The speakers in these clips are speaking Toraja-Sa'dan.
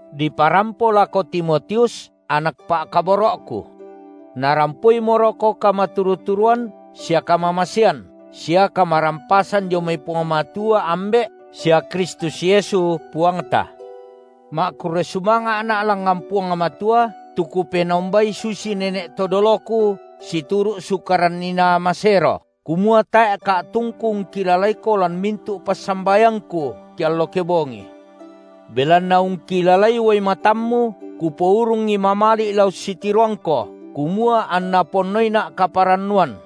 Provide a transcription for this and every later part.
diparampo lako Timotius, anak pa’kaboro’ku. Narampoimoroko kamaturu-turuan sia kamamasean sia kamarampasan dio mai Puang Matua, Ambe’ sia Kristus Yesu, Puangta. Ma’kurre sumanga’na’ langngan Puang Matua, tu kupenombai susi nene’ to doloku situru’ sukaran inaa masero, kumua tae’ ka’tungku ungkilalaiko lan mintu’ passambayangku keallo kebongi. Belanna ungkilalai uai matammu, kupourungi mamali’ la ussitiroangko, kumua anna ponnoina’ kaparannuan;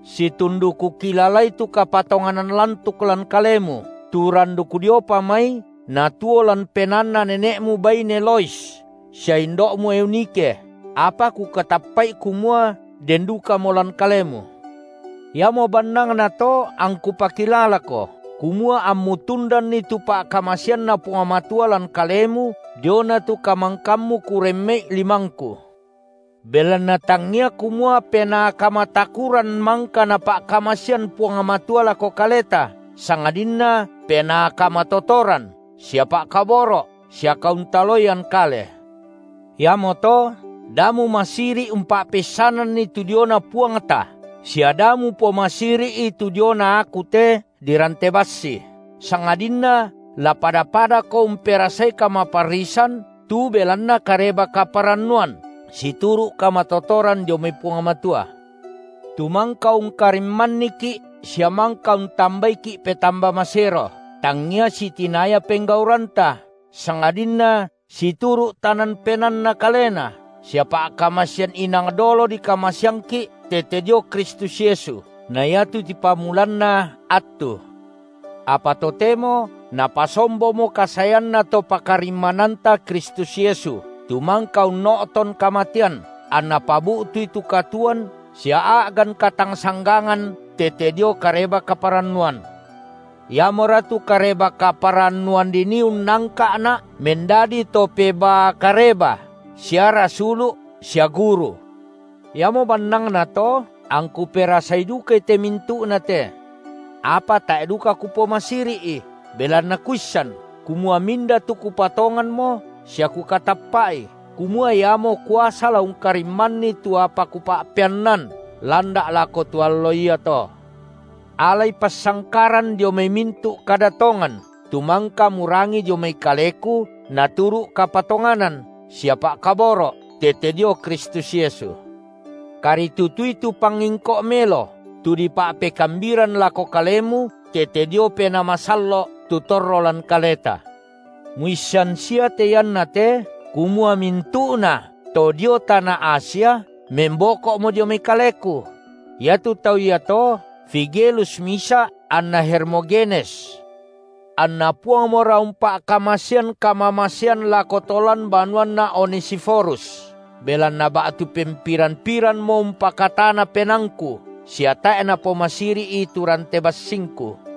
Situndu kukilalai tu kapatonganan lantuk lan kalemu, tu randuk diopa mai natuo lan penaanna nene’mu baine Lois sia indo’mu Eunike, apa kukatappa’i kumua den dukamo lan kalemu. Iamo bannangna to angku pakilalako, kumua ammu tundanni tu pa’kamaseanNa Puang Matua lan kalemu diona tu kamangkammu kuremme’i limangku. Belanna tangia kumua Penaa kamatakuran mangka Napa’kamasean Puang Matua lako kaleta, sangadinna Penaa kamatotoran sia pa’kaboro’ sia kauntaloian kale. Iamoto da mumasiri’ umpa’peissananni tu diona Puangta, sia da mupomasiri’i tu diona aku te dirante bassi, sangadinna la pada-padako umperasai kamaparrisan tu belanna Kareba-kaparannuan situru’ kamatotoran dio mai Puang Matua. Tu mangka ungkarimmanniki’ sia mangka untambaiki’ petamba masero, tangia sitinaya penggauranta, sangadinna situru’ tanan penaanNa Kalena sia pa’kamasean, inang dolo dikamaseangki’ tete dio Kristus Yesu na iatu tipamulanna attu, apa totemo napasombomo kasaeanNa Topakarimmananta Kristus Yesu, tu mangka unno’ton kamatean, anNa pabu’tui tu katuoan sia a’gan katangsanggangan tete dio Kareba-kaparannuan. Iamora tu Kareba-kaparannuan dinii unnangka’na’ mendadi to pebaa kareba sia rasulu’ sia guru. Iamo bannangnato, angku perasai dukai te mintu’nate. Apa tae’ duka kupomasiri’i, belanna kuissan kumua minda tu kupatonganmo sia kukatappa’i, kumua Iamo kuasa la ungkarimmanni tu apa kupa’peannan landa’ lako tu Allo iato. Alai passangkaran dio mai mintu’ kada tongan, tu mangka murangi dio mai kaleku naturu’ kapatonganan sia pa’kaboro’ tete dio Kristus Yesu. Karitutui tu pangingko’ melo, tu dipa’pekambiran lako kalemu tete dio Penaa Masallo’ tu torro lan kaleta. Muissan sia te iannate kumua mintu’nato dio tana Asia memboko’mo dio mai kaleku; iatu tau iato, Figelus misa’ anna Hermogenes. Anna Puangmora umpa’kamasean kamamasean lako to lan banuanna Onesiforus, belanna ba’tu pempiran-pirammo umpakatana penaangku, sia tae’ napomasiri’i tu rante bassingku,